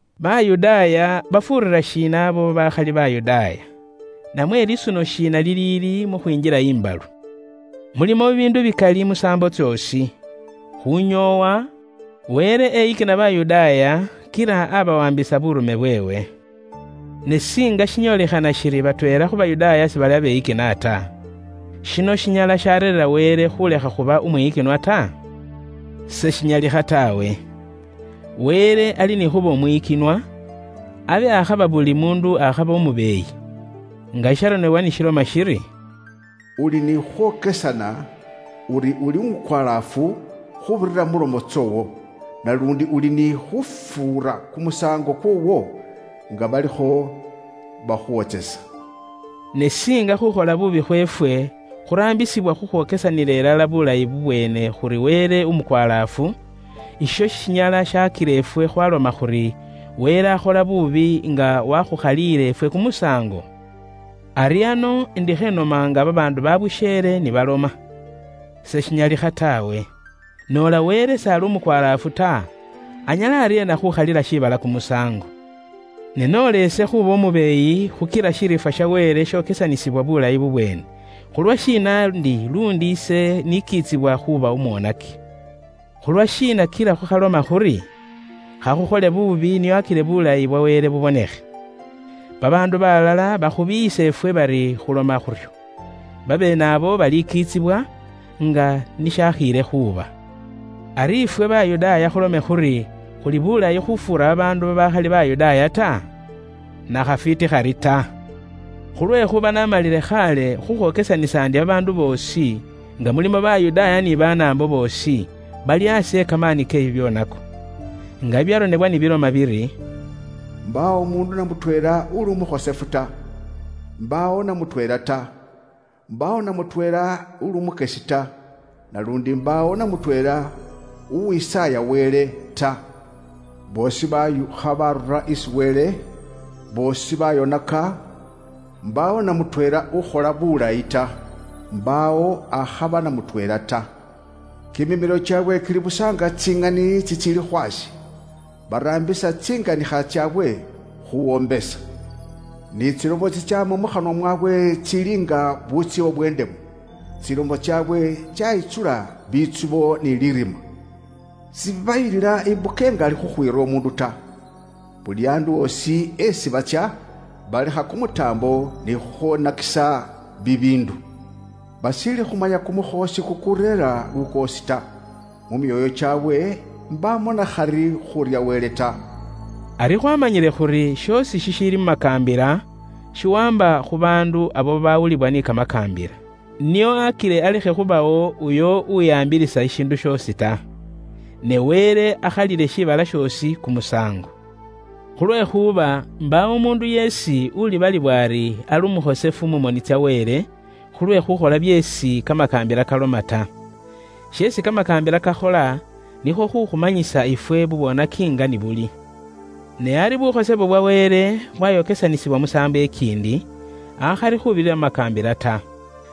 Bayudaaya bafuurira shiina abo babaakhali Bayudaaya? Namwe lisuno shiina liliili mu khwinjila imbalu? Mulimo bibiindu bikali mu saambo tsoosi. Khunyoowa, Wele eyikina Bayudaaya kila abawaambisa buurume bweewe. Ne singa shinyoolikhana shili batweela khu Bayudaaya sibali ni khufukiilila ta? Shino shinyala shareerera Wele khulekha khuba umwiyikinwa ta? Seshinyalikha taawe. Wele ali ni khuuba uwa ŋali, abe ikhaba nga buli muundu akhaba umubeeyi. Nga shisharonebwa ni shiloma shiri, “Uli ni khukhwokesana uri uli umukwalaafu khuubirira mu lomo tsoowo; naluundi uli ni khufuura kumusaango kwoowo nga balikho bakhuwotsesa.” Ne siinga bubwoonaki bweefwe buraambisibwa khukhwokesanila ilala bulayi bubweene khuri Wele ali umukwalaafu, isho shinyala shaakila ifwe khwaloma khuri Wele s'aali umwiyikinwa ta nga wakhukhaliile ifwe kumusaango? Ari ano indikho inoma nga babaandu babusheele ni baloma. Seshinyalikha taawe. Noola Wele s'ali umukwalaafu ta, anyala aryeena khukhalila shiibala kumusaango? Ne noola ise khuuba umubeeyi khukila bwa ŋali Wele bwokesanisibwa bulayi bubweene, khulwashiina ndi luundi ise nikiitsibwa khuuba umwonaki? Khulwashiina kila khukhaloma khuri, “Khakhukhole buubi nio akile buulayi bwa Wele bubonekhe?” Babaandu baalala baakhukhomyaasa ifwe bari khuloma khuryo. Babeene abo balikiitsibwa, nga ni shaakhiile khuuba. Ari ifwe Bayudaaya khulome khuri khuli bulayi khufuura babaandu babaakhali Bayudaaya ta? Nakhafwiiti khari ta! Khulwekhuuba naamalile khaale khukhwokesanisa ndi babaandu boosi, nga mulimo Bayudaaya ni Banaambo boosi, bali aasi e kamaani ke bibyoonako. Nga bibyaronebwa ni biloma biri, “Imbaawo umuundu na mutweela uli umukhosefu ta, imbaawo na mutweela ta; imbaawo na mutweela uli umukyesi ta. Naluundi imbaawo na mutweela uwisaaya Wele ta. Boosi bashuukha barura isi Wele; boosi bayonaka. Imbaawo na mutweela ukhola bulayi ta; imbaawo akhaba na mutweela ta. Kimimilo kyaabwe kili busa nga tsiŋani tsitsiili khwaashe. Baraambisa tsinganikha tsaabwe khuuwombesa, ni tsilomo tsitsaama mukhanwa mwaabwe tsili nga butsiba bwe indemu. Tsilomo tsaabwe tsaayitsula bitsubo ni lirima. Seshibayilila imbuka ingali khukhwiira umuundu ta. Buli andu osi eesi batsya balekha kumutaambo ni khukhwonakisa bibiindu. Bashiili khumanya kumukhoosi kukureera lukoosi ta. Mu myoyo kyaabwe imbaamo nakhari khuurya Wele ta.” Ari khwaamanyile khuri shoosi shishiili mu makaambila, shiwaamba khu baandu abo babawulibwa ni kamakaambila, nio akile alekhe khubawo uyo uwihaambilisa shishiindu shoosi ta. Ne Wele akhalile shiibala shoosi kumusaango. Khulwekhuuba imbaawo umuundu yeesi ulibalibwa ari ali umukhosefu mu moni tsa Wele, khulwe khukhola byeesi kamakaambila kaloma ta. Sheesi kamakaambila kakhola, nikhwo khukhumanyisa ifwe bubwoonaki nga ni buli. Ne ari bukhosefu bwa Wele bwayokesanisibwa musaambo ikiindi, akhali khuubirira mu makaambila ta.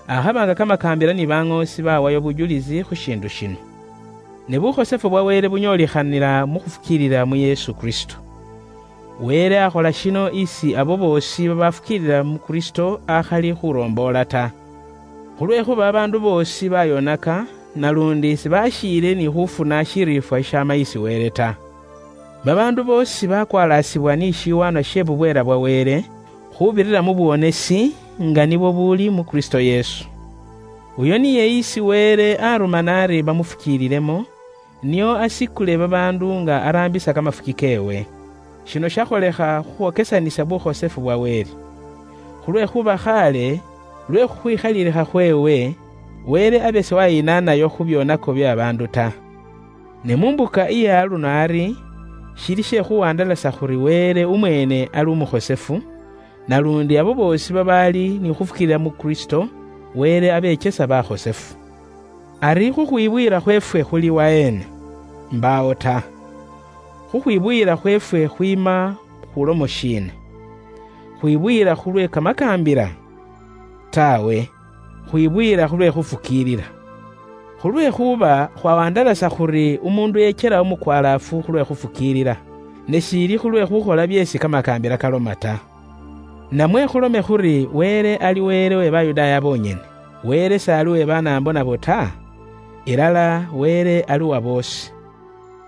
Akhaba nga kamakaambila ni baŋoosi bawayo bujulisi khu shiindu shino, ne bukhosefu bwa Wele bunyolikhanila mu khufukiilila mu Yesu Kristo. Wele akhola shino isi abo boosi babafukiilila mu Kristo akhali khuromboola ta. Khulwekhuuba babaandu boosi bayonaka, naluundi sibashiile ni khufuna shiriifwa shishaama isi Wele ta. Babaandu boosi bakwalaasibwa ni shiwaanwa she bubweela bwa Wele, khuubirira mu buwonesi, nga nibwo buli mu Kristo Yesu. Uyo niye isi Wele arumana ari bare khufukiilila mu niye, nio asikule babaandu nga araambisa kamafuki keewe. Shino shakholekha khukhwokesanisa bukhosefu bwa Wele. Khulwekhuuba khaale, lwe khukhwikhaliilikha khweewe, Wele abe siwayinaanayo khu byoonako bye babaandu ta. Ne mu mbuka iye aluno ari, shili she khuwandalasa khuri Wele umweene ali umukhosefu, naluundi abo boosi babaali ni khuufukiilila mu Kristo, Wele abekyesa bakhosefu. Ari khukhwibuyila khweefwe khuli waheena? Imbaawo ta! Khukhwibuyila khweefwe khwiima khu lomo shiina? Khwibuyila khulwe kamakaambila? Taawe. Khwibuyila khulwe khufukiilila. Khulwekhuuba khwawandalasa khuri umuundu ekyela umukwalaafu khulwe khufukiilila, ne shili khulwe khukhola byeesi kamakaambila kaloma ta. Namwe khulome khuri Wele ali Wele uwe Bayudaaya bonyene? Wele s'ali uwe Banaambo nabo ta? Ilala, Wele ali uwaboosi.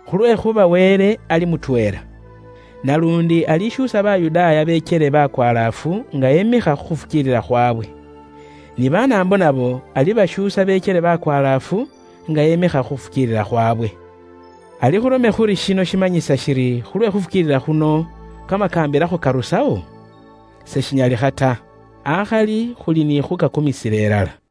Khulwekhuuba Wele ali mutweela. Naluundi alishuusa Bayudaaya bekyele Bakwalaafu nga emikha khukhufukiilila khwaabwe. Ni Banaambo nabo alibashuusa bekyele bakwalaafu nga emikha khu khufukiilila khwaabwe. Ari khulome khuri shino shimanyisa shiri khulwe khufukiilila khuno, kamakaambila khukarusawo? Seshinyalikha ta. Akhali khuli ni khuukakumisila ilala.